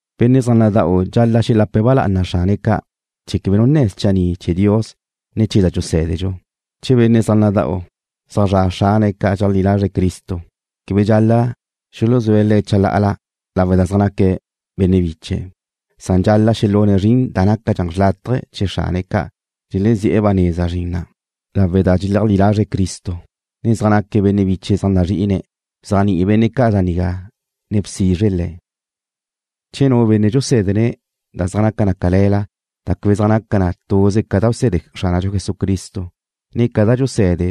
Benne' zaj nada'u dxal-la' xelápale̱'e̱ ba lá'ana xrane̱' ca' chee̱ quebe nu nne̱ schanni' chee̱ Dios, ne chee̱ da dxusé̱dedxu. Che benne' zaj nada'u, zaj zra' xrane̱' ca' dxeleajlí lazre̱' Cristo, quebe dxal-la' xuluzúe̱' le̱' chalá'ala lawe' da zaj naque̱' benne' biche̱', san dxal-la' xelune̱' zrin da nácadxa xrlátaje chee̱ xrane̱' ca' dxelezi'e̱ ba neza zrin na', lawe' da dxeleajlí lazre̱' Cristo, ne zaj naque̱' benne' biche̱' zaj nazri'ine̱'. Bzéajni'i benne' ca' da nigá ne bsizre le̱'. Che nu benne' dxusé̱dene̱' da zaj naca cale̱la da quebe zaj naca na tuze ca da bse̱de Xránadxu Jesucristo, ne ca da dxuse̱de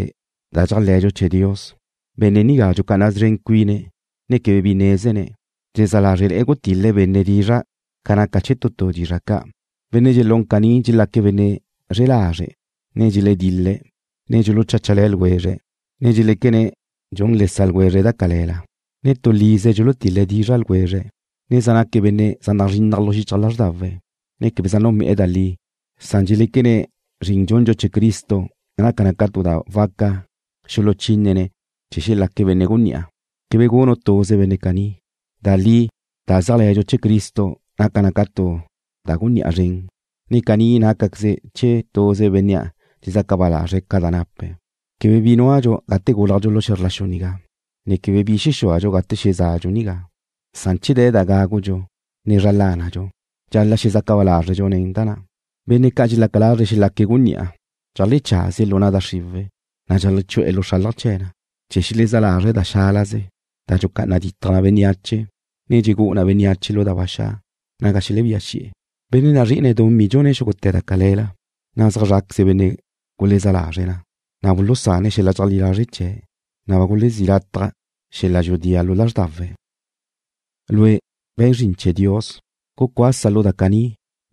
da dxéajle̱dxu chee̱ Dios, benne' nigá dxucá'ana szren cuine̱', ne quebe bi nézene̱'. Dxezá lázrele̱'e̱ gutil-le̱' benne' dizra' ca naca chee̱ tu tu dizra' ca'. Benne' dxelún caní: Dxelaque̱' benne' xre lazre', ne dxeledil-le̱', ne dxulucháchale̱ ljwezre̱', ne dxeléquene̱' dxun le sa' ljwezre̱' da cale̱la, ne tu lize dxulutil-la dizra' ljwezre̱', ne zaj naque̱' benne' zaj nazrinnaj lu xichaj lázrdawe̱', ne quebe zaj nunbe'e̱ da li. Dxeléquene̱' zrin dxundxu chee̱ Cristo naca na tu da waca xuluchínene̱' chee̱ xelaque̱' benne' gunní'a. Quebe gunu' tuze benne' caní. Da li da zéajle̱dxu chee̱ Cristo naca na tu da gunní'a zren, na' caní nácaqueze chee̱ tuze bénnea' dxezaca ba lazre̱' ca da nape̱'. Quebe bi núadxu gate gúlajdxu lu xe̱zr la xu nigá, ne quebe bi xexúadxu gate xezá'adxu nigá, san che de̱ da gágudxu, ne zra lánadxu, dxal-la' xezaca ba lázredxu nen da ca'. Benne' ca' dxelaca lazre̱' xelaque̱' gunní'a, cheajlecházie̱' lu na' da xriwe̱', na' cheajlechu'e̱ lu xralaj chee̱ le̱ na, chee̱ xelezá lazre̱' da xálaze, da dxulucá'ana ditaj na bénneache, ne dxelegú'u na bénneache lu da ba xa' naga xelebía xi'e̱. Benne' nazri'ine̱' dumí dxune̱' xúgute̱ da cale̱la, na' zaj zra' bal-la benne' gulezá lazre̱' na, na' bulusane̱' xel-la dxeleajlí lazre' chee̱', na' ba gulezí' lataj xel-la dxudía lu lázrdawe̱'. Lue', we̱n zrin chee̱ Dios, gucuasa lu da caní.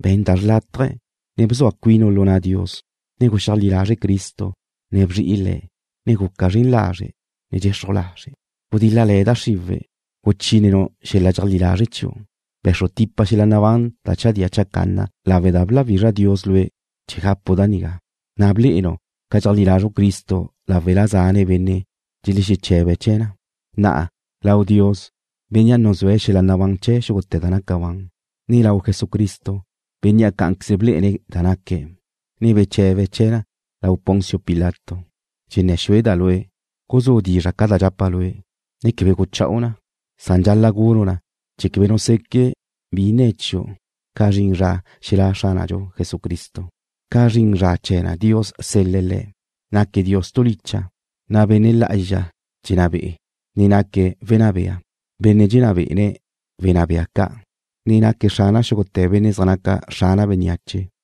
Be̱n da naca xlátaje̱, ne bzua cuinu' lu na' Dios, ne guxeajlí lazre' Cristo, ne bzri'i Le̱', ne guca zren lazre', ne dxexruj lazre'. Gudíl-lale̱ da xriwe̱', guchínenu' xel-la dxeajlí lazre' chiu'. Be̱xru tipa xel-la nabán da chadía chacanna lawe' da bláwizra Dios lue' chee̱ gapu' da nigá, na' ba blé'enu' ca dxeajlí lazru' Cristo láwela zane' benne' dxelexeche̱be̱' chee̱ na. Na'a, lau Dios, Bénnea' nuzúe̱' xel-la nabán chee̱ xúgute̱ da naca ban, ne lau Jesucristo, Bénnea' cá'anqueze blé'ene̱' da naque̱', ne beche̱be̱' chee̱ na lau Poncio Pilato, dxenné̱ xueda' lue'. Guzú' dizra' ca da dxapa' lue', ne quebe gucha'u na. Dxal-la' gunu' na chee̱ quebe nu seque' bi nne̱ chiu' ca zrin zra xelá' Xránadxu Jesucristo. Ca zrin zra chee̱ na Dios sel-le̱' Le̱'. Naque̱' Dios tu licha', na' Benne' Lá'azxa dxenná be'e̱. Naque̱' Wenná bea, Benne' dxenná be'ene̱' wenná bea ca', ne naque̱' Xrana xúgute̱ benne' zaj naque̱' xrana bénneache.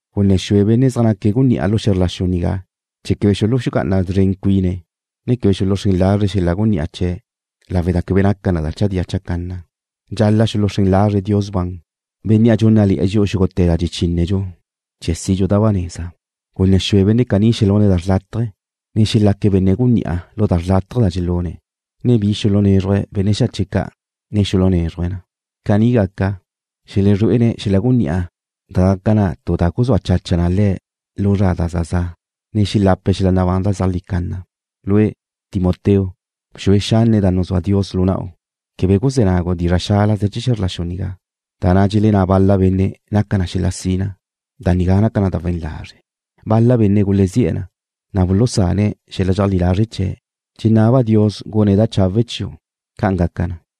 Gunné̱ xue benne' zaj naque̱' gunní'a lu xe̱zr la xu nigá chee̱ quebe xulucá'ana szren cuine̱', ne quebe xuluxrén lazre̱' xel-la gunní'a chee̱', lawe' da quebe naca na da chadía chacanna. Dxal-la' xuluxrén lazre̱' Dios ban, Bénnea' dxúnnale̱'e̱ dxi'u xúgute̱ da dxechínedxu chee̱ sidxu da ba neza. Gunné̱ xue benne' caní xelune̱' da xrlátaje, ne xelaque̱' benne' gunní'a lu da xrlátaje da xelune̱', ne bi xulunézruje̱' benne' xache' ca', ne xulunézrujle̱'e̱ na. Caní gaca, xelezrué'ene̱' xel-la gunní'a da gaca na tu da guzúa chacha na le̱' lu zra da za za', ne xelape̱' xel-la nabán da zeajlí canna. Lue', Timoteo, bxue xanne da nuzúa Dios lu na'u. Quebe guzé̱ nagu' dizra' xálaze chee̱ xe̱zr la xu nigá, da na' dxelenná bal-la benne' naca na xel-la sina. Da nigá naca na da we̱n lazre'. Bal-la benne' gulezí'e̱ na, na' bulusane̱' xel-la dxeleajlí lazre' chee̱'. Dxenábeda' Dios gune̱' da chawe' chiu'. ¡Ca'an gaca na!